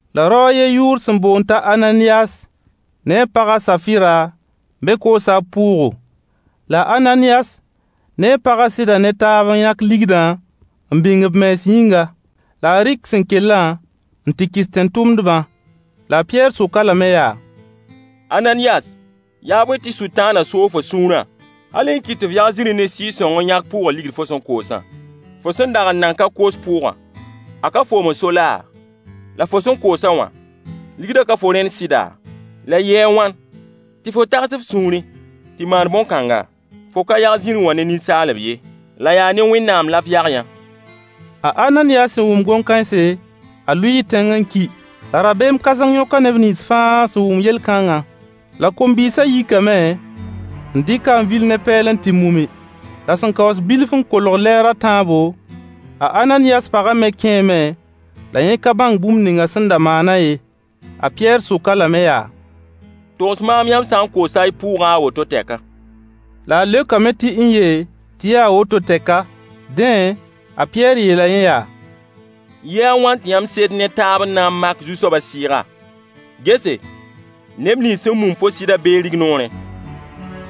La rao a yen yʋʋr sẽn boond t'a Ananiyas ne a paga a Safɩra me koosa b pʋʋgo. La a Ananiyas ne a paga seda ne taab n yãk ligdã n bĩng b mens yĩnga. La a rɩk sẽn kellã n tɩ kɩs tẽn-tʋmdbã. La a Pɩyɛɛr sok-a lame yaa: Ananiyas, yaa bõe tɩ Sʋtãana soog fo sũurã hal n kɩt tɩ f yag zĩrĩ ne Sɩɩg-sõng n yãk pʋʋgã ligd fo sẽn koosã? Fo sẽn dag n nan ka koos pʋʋgã, a ka foom n so laa? La fo sẽn koos-a wã ligdã ka fo rẽnd sɩda? La yɩɩ a wãn tɩ fo tags f sũurẽ tɩ maan bõn-kãnga? Fo ka yag zĩrĩ wã ne ninsaalb ye, la yaa ne Wẽnnaam la f yag-yã. A Ananiyas sẽn wʋm gom-kãense a lʋɩɩ tẽng n ki. La rabeem kãseng yõka neb nins fãa sẽn wʋm yel-kãnga La kom-bɩɩsa yikame n dɩk-a n vil ne pɛɛl n tɩ mumi. La sẽn kaoos bilf n kolg lɛɛr a tãabo, a Ananiyas pagã me kẽeme la yẽ ka bãng bũmb ninga sẽn da maana ye. A Pɩyɛɛr sok-a lame yaa: Togs maam yãmb sã n koosa y pʋʋgã a woto tɛka. La a leokame tɩ n-ye, tɩ yaa woto tɛka. Dẽ, a Pɩyɛɛr yeela yẽ yaa: Yɩɩ a wãn tɩ yãmb sed ne taab n na n mak Zu-soabã Sɩɩga? Gese, neb nins sẽn mum fo sɩdã bee rignoorẽ,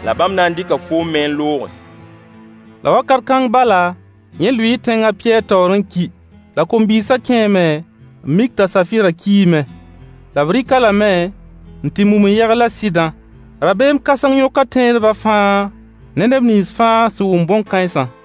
la bãmb na n dɩka foom me n looge. La wakat kãng bala, yẽ lʋɩɩ tẽng a Pɩyɛɛr taoor n ki. La kom-bɩɩsã kẽeme n mik t'a Safɩra kiime. La b rɩk-a lame n tɩ mum n yegl a sɩdã. Rabeem kãseng yõka tẽedba fãa ne neb nins fãa sẽn wʋm bõn-kãensa.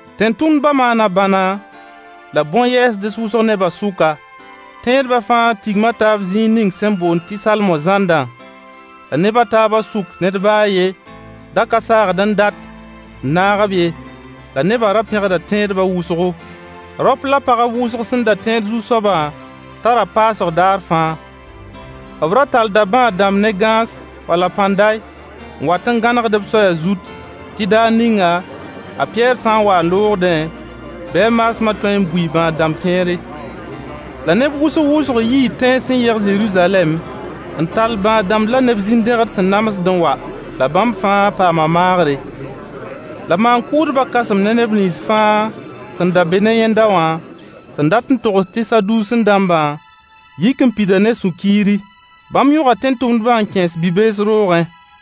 Tẽn-tʋmdba maana bãna la bõn-yɛɛsds wʋsg nebã sʋka. Tẽedba fãa tigma taab zĩig ning sẽn boond tɩ Salmo zãndã. La neb a taabã sʋk ned ba a yen da ka saagd n dat n naag-b ye. La nebã ra pẽgda tẽedba wʋsgo. Raop la pagb wʋsg sẽn da tẽed Zu-soaba tara paasg daar fãa. B ra tallda bãad-dãmb ne gãas wala pãnday n wat n gãnegd-b soaya zut tɩ daar ninga a Pɩyɛɛr sã n wa n loogdẽ, bɩ a maasma tõe n bui bãad-dãmb kẽere. La neb wʋsg-wʋsg yii tẽns sẽn yeg Zeruzalɛm n tall bãad-dãmb la neb zĩn-dẽged sẽn namsd n wa. La bãmb fãa paama maagre. La maan-kʋʋdba kãsem ne neb nins fãa sẽn da be ne yẽnda wã, sẽn dat n togs tɩ Saduusẽ-dãmbã, yik n pida ne sũ-kiiri. Bãmb yõga tẽn-tʋmdbã n kẽes bi-bees roogẽ.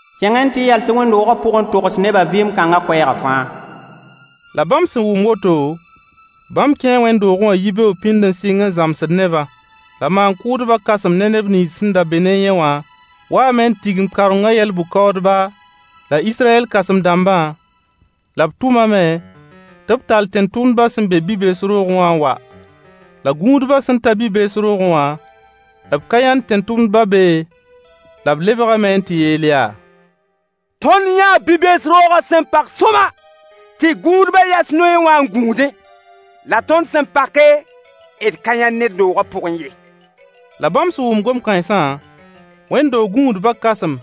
Kẽng-y n tɩ yals-y wẽnd-doogã pʋg n togs nebã vɩɩm kãnga koɛɛga fãa. La bãmb sẽn wʋm woto, bãmb kẽe wẽnd-doogẽ wã yibeoog pĩnd n sɩng n zãmsd nebã. La maan-kʋʋdba kãsem ne neb nins sẽn da be ne yẽ wã waame n tigim kaorengã yɛl-bʋ-kaoodba la Israyɛl kãsem-dãmbã, La b tʋmame tɩ b tall tẽn-tʋmdbã sẽn be bi-bees roogẽ wã n wa La gũudba sẽn ta bi-bees roogẽ wã, b ka yãnd tẽn-tʋmdbã be ye. La b lebgame n tɩ yeel yaa: Tõnd yãa bi-bees roogã sẽn pag sõama, tɩ gũudbã yas noyẽ wã n gũudẽ. La tõnd sẽn pake d ka yã ned doogã pʋgẽ ye. La bãmb sẽn wʋm gom-kãensã, wẽnd-doog gũudbã kãsem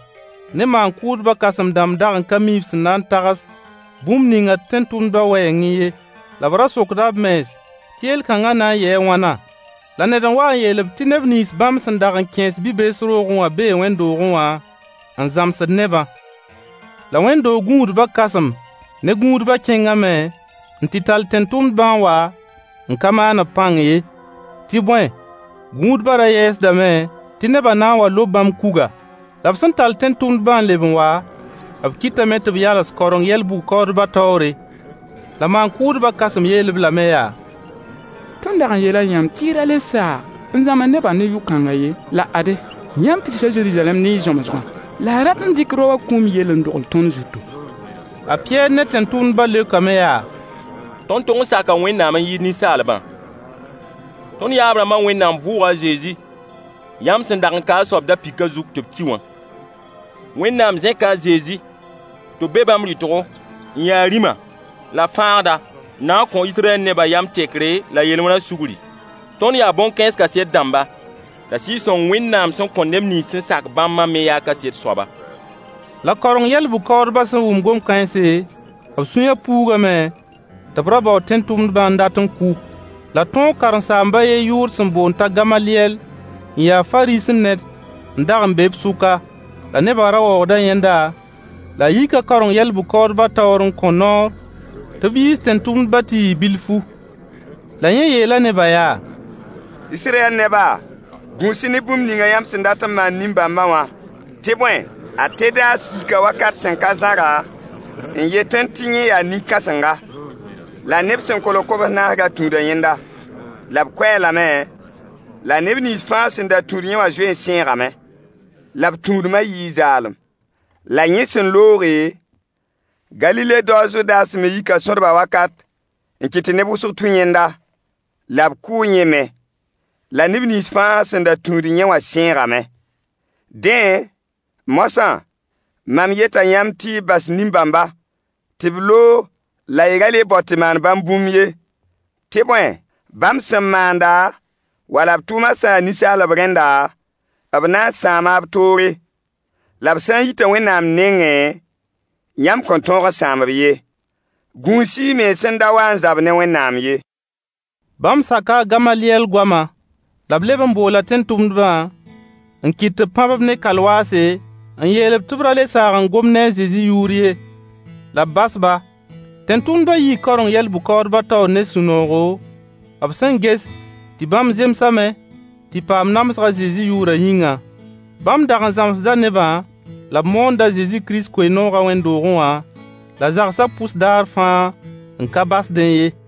ne maan-kʋʋdba kãsem-dãmb dag n ka mi b sẽn na n tags bũmb ninga tẽn-tʋmdbã wɛɛngẽ ye, la b ra sokda b mens tɩ yel-kãnga na n yɩɩ a wãna. La ned n wa n yeel-b tɩ neb nins bãmb sẽn dag n kẽes bi-bees roogã bee wẽnd-doogẽ wã n zãmsd nebã. La wẽnd-doog gũudbã kãsem ne gũudba kẽngame n tɩ tall tẽn-tʋmdbã n wa n ka maan-b pãng ye. Tɩ bõe, gũudba ra yɛɛsdame tɩ nebã na n wa lob bãmb kuga. La b sẽn tall tẽn-tʋmdbã n leb n wa, b kɩtame tɩ b yals kaoreng yɛl-bʋ-kaoodbã taoore. La maan-kʋʋdba kãsem yeel-b lame yaa: Tõnd dag n yeela yãmb tɩ y ra le saag n zãms nebã ne yʋ-kãngã ye. La ade, yãmb pidsa Zeruzalɛm ne y zãmsgã. La y rat n dɩk raowã kũum yell n dogl tõnd zutu! A Pɩyɛɛr ne tẽn-tʋmdbã leokame yaa: Tõnd tog n saka Wẽnnaam n yɩɩd ninsaalbã. Tõnd yaab-rãmba Wẽnnaam vʋʋga a Zezi yãmb sẽn dag n ka a soab da-pɩkã zug tɩ b ki wã. Wẽnnaam zẽka a Zezi tɩ b be bãmb rɩtgo n ya rĩma la fãagda n na n kõ Israyɛl nebã yam tekre la yel-wẽna sugri. Tõnd yaa bõn-kãens kaset dãmba. La Sɩɩg-sõng Wẽnnaam sẽn kõ neb nins sẽn sak bãmbã me yaa kaset soaba. La kaoreng yɛl-bʋ-kaoodbã sẽn wʋm gom-kãense, b sũyã puugame tɩ b ra baood tẽn-tʋmdbã n dat n kʋ. La tõog karen-saamb a yen yʋʋr sẽn boond t'a Gamalyɛll n ya Fariisẽ ned n dag be b sʋka. La neba ra waoogda yẽnda la a yika kaoreng yɛl-bʋ-kaoodbã taoor n kõ noor tɩ yiis tẽn-tʋmdbã tɩ yɩ bilfu. La yẽ yeela nebã yaa: Israyɛl neba, gũus-y ne bũmb ningã yãmb sẽn dat n maan nin-bãmba wã. Tɩ bõe, a Tedaas yika wakat sẽn ka zãra n yetẽ tɩ yẽ yaa nin-kãsenga. La neb sẽn kolg kobs naas da tũuda yẽnda. La b kʋ-a lame, la neb nins fãa sẽn da tũud yẽ wã zoe n sãeegame, la b tũudma yɩɩ zaalem. La yẽ sẽn looge, Galile dao a Zudas me yika sõdbã wakat n kɩt tɩ neb wʋsg tũ yẽnda. La b kʋʋ yẽ me, la neb nins fãa sẽn da tũud yẽ wã sãeegame. Dẽ, moasã, mam yeta yãmb tɩ y bas nin-bãmba tɩ b loog la y ra le bao tɩ maan bãmb bũmb ye. Tɩ bõe, bãmb sẽn maanda, wala b tʋʋma sã yaa ninsaalb rẽnda, b na n sãama b toore. La b sã n yita Wẽnnaam nengẽ, yãmb kõn tõog n sãam-b ye. Gũus-y y mens n da wa n zab ne Wẽnnaam ye. Bãmb saka a Gamalyɛl goama. La b leb n boola tẽn-tʋmdbã n kɩt tɩ b pãb-b ne kalwaase n yeel-b tɩ b ra le saag n gom ne a Zezi yʋʋr ye. La b bas-ba. Tẽn-tʋmdbã yii kaoreng yɛl-bʋ-kaoodbã taoor ne sũ-noogo b sẽn ges tɩ bãmb zemsame tɩ paam namsg a Zezi yʋʋrã yĩnga. Bãmb dag n zãmsda nebã la b moond Kirist Zezi koe-noogã wẽnd-doogẽ wã la zagsã pʋs daar fãa n ka basdẽ ye.